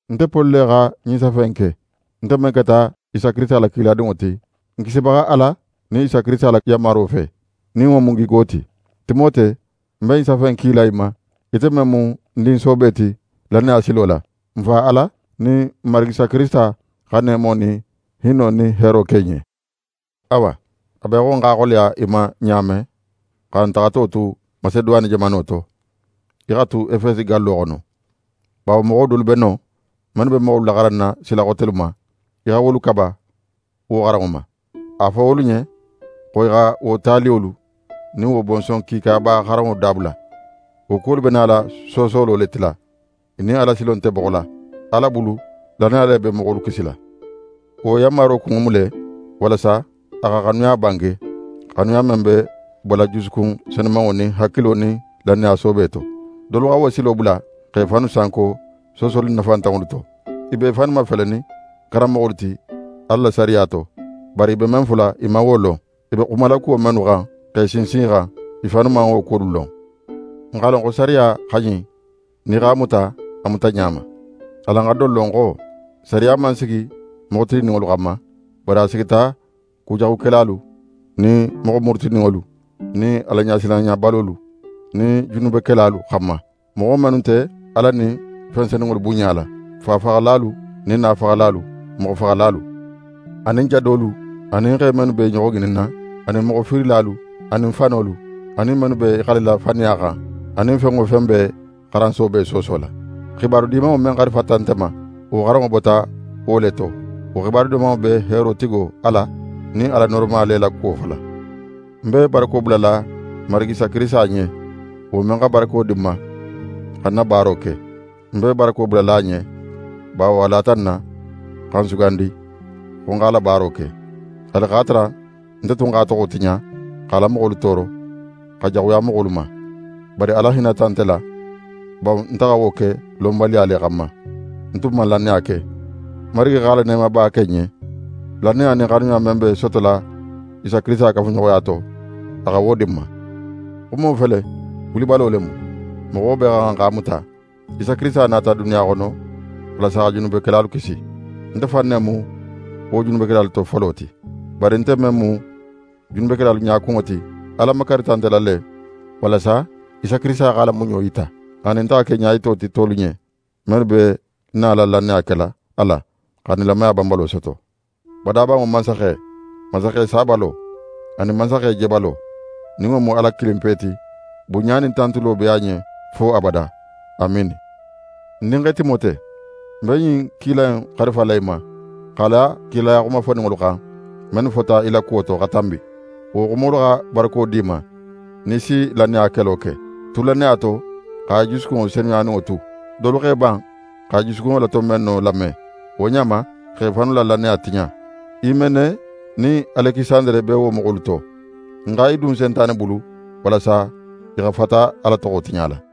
Nte Poli le xa ɲin safe in ke. Nte men keta Isa Kirisita la kiladinŋo ti, n Kisibaxa Ala nin Isa Kirisita la yanmaro fe, nin wo mu n gigo ti. Timote, ń be ɲin safe in kila í ma, ite men mu ń din soobe ti lannaya silo la. N Fa Ala nin n Marigi Isa Kirisita xa neemo nin hinno nin heero ke í ɲen. Awa, a be í xo ń x'a xoleya í ma ɲa men, xa ń taxato tu Maseduwane jamano to, í xa tu Efesi gallo xono. Bawo moxo dolu be non, mennu be moxolu laxaranna sila xotelu ma. Í xa wolu kaba wo xaranŋo ma. A fo wolu ɲen xo i xa wo taliyolu nin wo bonson kiikaba xaranŋo dabula. Wo kuwolu be nala soosolo le tila. I nin Alasilo nte boxo la. Ala bulu, lannaya le be moxolu kisila. Wo yanmaro kunŋo mu le, walasa a xa xanuya bange, xanuya men be bola jusukun senumanŋo nin hakilo nin lannaya soobe to. Dolu xa wo silo bula, x'e fannu sanko soosoli nafantanŋolu to. I b'e fannu mafelenin karanmoxolu ti Ala la sariya to. Bari i be men fola, i man wo lon. I be xumala kuwo mennu xan, x'e sinsin i xan, i fannu man wo kuwolu lon. N x'a lon xo sariya xa ɲin, nin í x'a muta a mutaɲa ma. Alan xa don lon xo, sariya man sigi moxo tilinninŋolu xanma; bari a sigita kujaxukelalu nin moxo murutininŋolu nin Alaɲasilanɲabalolu nin junubekelalu xanma, moxo mennu nte Ala nin fen senunŋolu bunɲala, fa faxalalu nin na faxalalu, moxofaxalalu, anin jadolu, anin xe mennu be i ɲoxo ŋininna, anin moxo fiirilalu, anin fanolu, anin mennu be i xalila faniya xan, anin fen wo fen be xaran soobe soosola. xibaru Dimanŋo men xarifata nte ma, wo xaranŋo bota wo le to. Wo Xibaru Dimanŋo be heero tigo Ala nin Ala nooroma le la kuwo fola. Ń be barako bulala Marigi Isa Kirisita ɲen, wo men xa barako di ń ma xa ń na baaro ke. Ń be barako bulala a ɲen, bawo a lata ń na xa ń sugandi xo ń x'a la baaro ke. Haali x'a tara nte tun x'a toxo tiɲa, x'a la moxolu tooro, xa jaxuya moxolu ma. Bari Ala hinnata nte la, bawo nte xa wo ke lonbaliya le xanma. Ń tun man lannaya ke. N Marigi x'a la neemaba ke ń ɲen. Lannaya nin xanuya men be sotola Isa Kirisita kafuɲoxoya to, a xa wo di ń ma. Xumo fele, wulibalo le mu. Moxo bee xa xan x'a muta. Isa Kirisita nata duniya xono, walasa xa junubekelalu kisi. Nte fan ne mu wo junubekelalu to folo ti. Bari nte men mu junubekelalu ɲakunŋo ti, Ala makarita nte la le, walasa Isa Kirisita x'a la muɲo yita, anin nte xa ke ɲayito ti tolu ɲen, mennu be nala lannaya kela a la, xa nilamaya banbalo soto. Badabanŋo Mansaxe, Mansaxe sabalo, anin Mansaxe jebalo, nin wo mu Ala kilinpe ti, bunɲa nin tantulo be a ɲen fo abada. Amiini. Ń dinxe Timote, ń be ɲin kila in xarifala í ma, x'a la kilaya xumafoninŋolu xan, mennu fota í la kuwo to xa tanbi. Wo xumolu xa barako d'í ma, nin í si lannaya kelo ke. Tu lannaya to, xa í jusukunŋo senumanŋo tu. Dolu x'e ban xa i jusukunŋo la tonbenno lame. Wo ɲa ma, i xa i fannu la lannaya tiɲa. Himene nin Alekisandere be wo moxolu to. Ń xa i dun Sentane bulu, walasa i xa fata Ala toxo tiɲala.